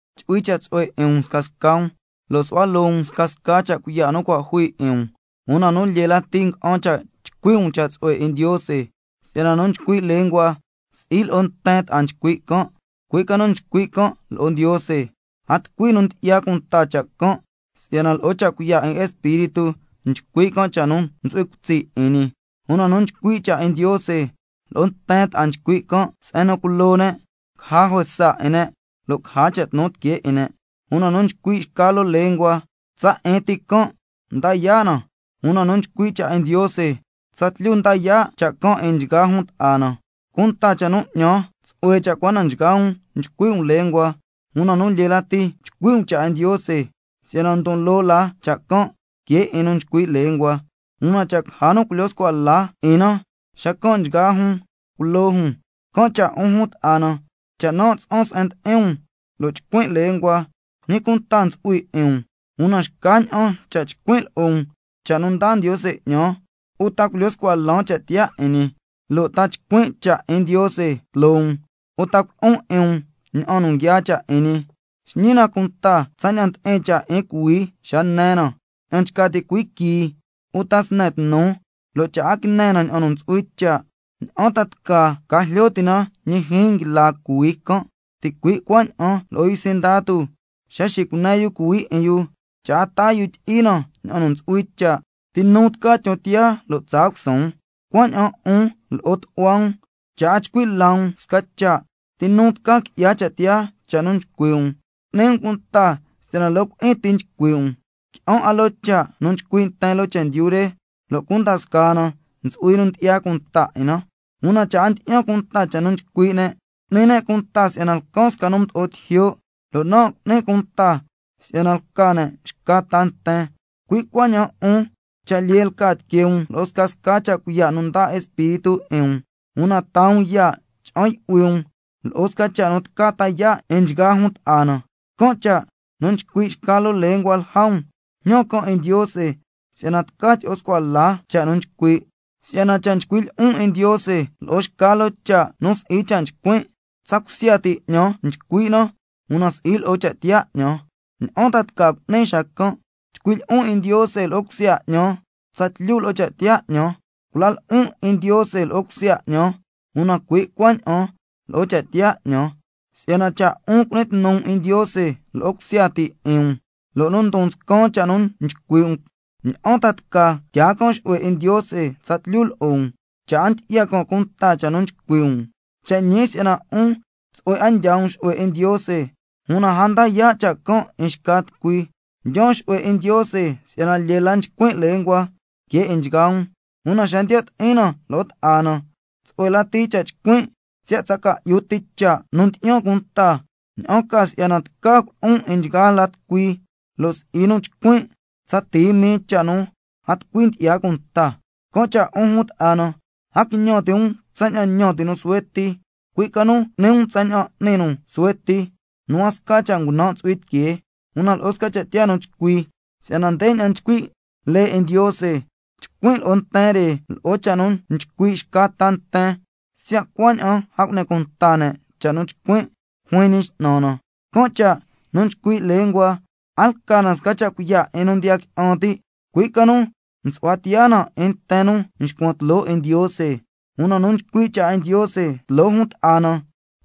Chu'hui cha' tsu'hue 'in um scasca um, lo' su'hua loo um scasca cha' cuiya' nu cua' jui 'in um, una nu lyee lati nga'an cha' chcui' um cha' tsu'hue 'in Ndiose. Si'yana nu nchcui' lenguas, si'i lo'o nten ta'a nchcui' can', cui' ca nu nchcui' can' lo'o Ndiose, si'yana a tucui nu ndyi'ya cunta cha' can', siya' lo'o cha' cuiya' 'in Espíritu nchcui' can' cha' nu ntsu'hui cutsi' 'in ñi. Una nu nchcui' cha' 'in Ndiose, lo'o nten ta'a nchcui' can' se'en nu culo ne', caja juesa 'in ne', lo' caja cha' tnu tiquee 'in ne'. Una nu nchcui' xca loo lengua, tsa 'in ti can' nda yaa' na, una nu nchcui' cha' 'in Ndiose, tsatlyu nda yaa' cha' can' 'in nchgaa jun ta'a na. Cunta cha' nu 'ñan, tsu'hue cha' cua na nchgaa um chcui' um lenguas, una nu lyee lati chcui' um cha' 'in Ndiose, si'yana ndon loo la cha' can' que 'in nu nchcui' lenguas, una cha' caja nu culyo scua la 'in na xacan' nchgaa jun culo jun. Can' cha' 'un jun ta'a na, cha' nan' tsa'an se'en ndi'in um lo' chcuin' lenguas, ¿ñi cunta ntsu'hui 'in um? Una xcaña'an cha' chcuin' lo'o um cha' nu ndaa Ndiose 'ñan, uta culyo scua lan cha' tiyaa 'in ñi, lo' ta chcuin' cha' 'in Ndiose tloo um, uta culo'on 'in um ña'an nu nguiaa cha' 'in ñi. Xñi na cunta tsaña'an ndi'in cha' 'in cuhuii xa ne na, ña'an nchca ti' cuhuii quii uta sne tnu, lo' cha' a quine na ña'an nu ntsu'hui cha', ¿ña'an ta ca jlyo ti' na ñi jyiin nguila cuhuii can'? Ticui' cuaña'an lo'o yu sindatu xa nxicune yu cuhuii 'in yu, cha' a taa yu tyi'i na ña'an nu ntsu'hui cha', ¿ti nu tca tyon tiyaa lo' tsaa cusuun? Cuaña'an 'un lo'o tu'hua um cha' a chcui' la um sca cha', ¿ti nu tca qui'ya cha' tiyaa cha' nu chcui' um? Cu'ni um cunta si'yana loo cui'in ti nchcui' um. Qui'an 'a loo cha' nu nchcui' nten loo chendyu re, lo' cunda scaa na ntsu'hui nu ndyi'ya cunta 'in na. Una cha' a ndyi'yan cunta cha' nu nchcui' xca tucui, cu'ni can' cunta si'yana lcan sca nu mdo'o tijyo', lo' nan' cu'nin cunta si'yana lca can' xca ta nten. Cui' cuaña'an 'un cha' lyee lca tiquee um lo'o scasca cha' cuiya' nu ndaa Espíritu 'in um, una taa um ya' cha'an yu'hui um lo'o sca cha' nu tca ta yaa' 'in nchgaa jun ta'a na. Can' cha' nu nchcui' xca loo lengua lja um, jñan can' 'in Ndiose si'yana tca tyi'o scua la cha' nu nchcui'. Si'yana cha' chcuin' lyi'on 'in Ndiose lo'o xca loo cha' nu si'i cha' nchcuin', tsa cusya ti 'ñan nchcui' na, una si'i lo'o cha' tiyaa 'ñan. ¿Ña'an ta cu'nin xacan'? Chcuin' lyi'on 'in Ndiose lo'o cusya 'ñan tsatlyu lo'o cha' tiyaa 'ñan. Cula lo'on 'in Ndiose lo'o cusya 'ñan, una cui' cuaña'an lo'o cha' tiyaa 'ñan. Si'yana cha' 'un cu'ni tnu um 'in Ndiose lo'o cusya ti 'in um, lo' nu ndon nscan cha' nu nchcui' um, ¿ña'an ta tca tyaa can' xu'hue 'in Ndiose tsatlyu lo'o um, cha' a ndyi'ya can' cunta cha' nu nchcui' um? Cha' ñi si'yana 'un tsu'hue 'a ndyaa um xu'hue 'in Ndiose, una a nda yaa' cha' can' 'in xca tucui. Nan' ndyaan xu'hue 'in Ndiose si'yana lyee la nchcuin' lenguas que 'in nchgaa um, una xa ndiyo' ti'in na lo'o ta'a na, tsu'hue lati cha' chcuin' siya' ca'yu ti cha' nu ndyi'yan cunta, ña'an ca si'yana tca culo'on 'in nchgaa la tucui, lo' si'i nu chcuin' tsa tii mii cha' nu a tucui ndyi'ya cunta. Can' cha' 'un jun ta'a na, a quiñan ti' um tsaña'an ñan ti' nu suhue ti, cui' ca nu cu'ni um tsaña'an n'ni nu suhue ti nu a sca cha' ngunan' ntsu'hui tiquee, una lo'o sca cha' tiyaa nu chcui. Si'yana ndeña'an nchcui' lee 'in Ndiose: —Chcuin' lo'o nten re lo'o cha' nu nchcui' xca ta nten, siya' cuaña'an a cu'ni cunta ne' cha' nu chcuin'—, juin Ñi X'nan na. Can' cha' nu nchcui' lenguas, a lca na sca cuiya' 'in nu ndiya qui'an ti', cui' ca nu nsu'hua tiyaa na 'in nten nu nxcuan tloo 'in Ndiose. Una nu nchcui' cha' 'in Ndiose tloo jun ta'a na,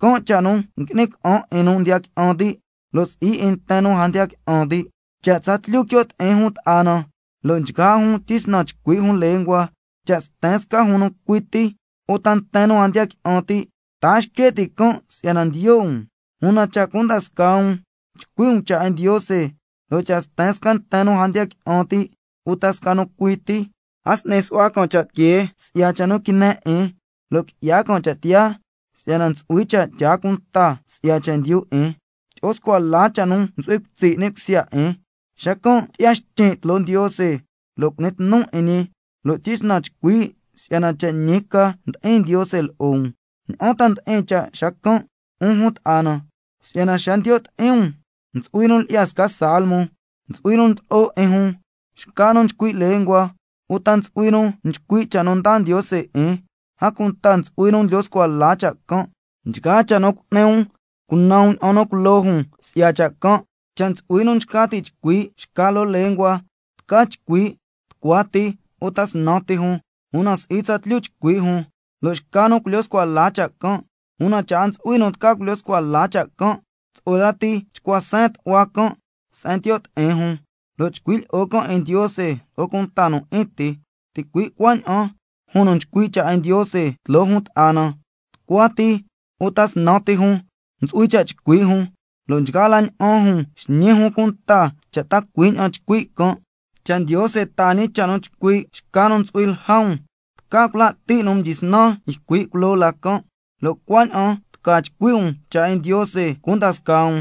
can' cha' nu ngui'ni ca'an 'in nu ndiya qui'an ti', lo' si'i 'in nten nu a ndiya qui'an ti'. Cha' tsatlyu quio' ti'in jun ta'a na, lo' nchgaa jun tyisnan chcui' jun lenguas, lo' cha' sten sca jun nu cui ti uta nten nu a ndiya qui'an ti', ¿ta a xque' ti' can' si'yana ndiyo' um? Una cha' cunda scaa um chcui' um cha' 'in Ndiose, lo' cha' sten sca nten nu a ndiya qui'an ti' uta sca nu cui ti, a s'ni su'hua can' cha' tiquee si'ya cha' nu quine 'in, lo' qui'ya can' cha' tiyaa si'yana ntsu'hui cha' tyaa cunta si'ya chendyu 'in, tyi'o scua la cha' nu ntsu'hui cutsi' ni' cusya 'in, xacan' tyi'ya xtyin' tloo Ndiose lo' cu'ni tnu 'in ñi, lo' tyisnan chcui' si'yana cha' ñi ca ndi'in Ndiose lo'o um. ¿Ña'an ta ndi'in cha' xacan', 'un jun ta'a na? Si'yana xa ndiyo' ti'in um ntsu'hui nu lyi'ya sca salmo, ntsu'hui nu ndlo'o 'in jun, xca nu nchcui' lenguas, uta ntsu'hui nu nchcui' cha' nu ndaa Ndiose 'in, a cunta ntsu'hui nu ndlyo scua la cha' can'. Nchgaa cha' nu cu'ni um, cunan um ña'an nu culo jun si'ya cha' can'. Cha' ntsu'hui nu nchca ti' chcui' xca loo lengua, tca chcui' tucua ti uta snan ti jun, una si'i tsatlyu chcui' jun, lo' xca nu culyo scua la cha' can'. Una cha' a ntsu'hui nu tca culyo scua la cha' can', tsu'hue lati chcua seen tu'hua can' se'en ndiyo' ti'in jun, lo' chcui' lyi'o can' 'in Ndiose lo'o cunta nu 'in ti. Ticui' cuaña'an jun nu chcui' cha' 'in Ndiose tloo jun ta'a na, tucua ti uta snan ti jun ntsu'hui cha' chcui' jun, lo' nchgaa la ña'an jun xñi jun cunta cha' ta cui' ña'an nchcui' can'. Cha' Ndiose taa ñi cha' nu chcui' xca nu ntsu'hui lja um, tca cula' ti' nu mdyisnan ycui' culoo la can', lo' cuaña'an tca chcui' um cha' 'in Ndiose cunda scaa um,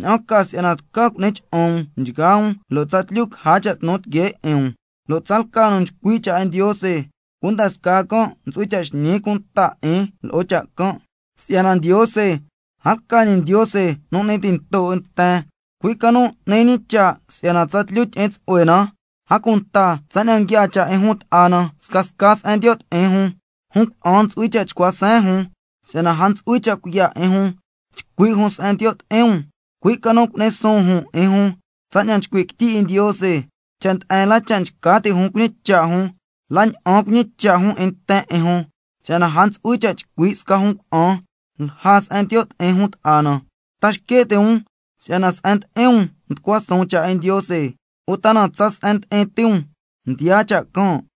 ña'an ca si'yana tca cu'ni cha'an um nchgaa um lo' tsatlyu caja cha' tnu tiquee 'in um. Lo' tsalca nu nchcui' cha' 'in Ndiose, cunda scaa can' ntsu'hui cha' xñi cunta 'in lo'o cha' can', si'yana Ndiose a lca ñi Ndiose nu n'ni tinto 'in nten, cui' ca nu n'ni ñi cha' si'yana tsatlyu tyi'in tsu'hue na. A cunta tsaña'an nguiaa cha' 'in jun ta'a na scasca se'en ndiyo' ti'in jun, jun cuna'an ntsu'hui cha' chcua seen jun, si'yana a ntsu'hui cha' cuiya' 'in jun chcui' jun se'en ndiyo' ti'in um, cui' ca nu cu'ni suun jun 'in jun tsaña'an nchcui' quityi 'in Ndiose. Cha' nde'en la cha' nchca ti' jun cuñicha' jun, la na'an cuñicha' jun 'in nten 'in jun, si'yana a ntsu'hui cha' chcui' sca jun cuna'an lja se'en ndiyo' ti'in jun ta'a na. ¿Ta xque' ti' um si'yana se'en ndi'in um mducua suun cha' 'in Ndiose, uta na tsa se'en ndi'in ti um mdiyaa cha' can'?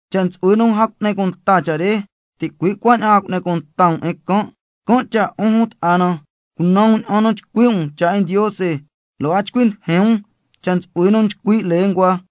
Cha' ntsu'hui nu a cu'ni cunta cha' re, ticui' cuaña'an a cu'ni um cunta 'in can'. Can' cha' 'un jun ta'a na, cunan um ña'an nu chcui' um cha' 'in Ndiose, lo' a chcui ndijin um cha' ntsu'hui nu nchcui' lenguas,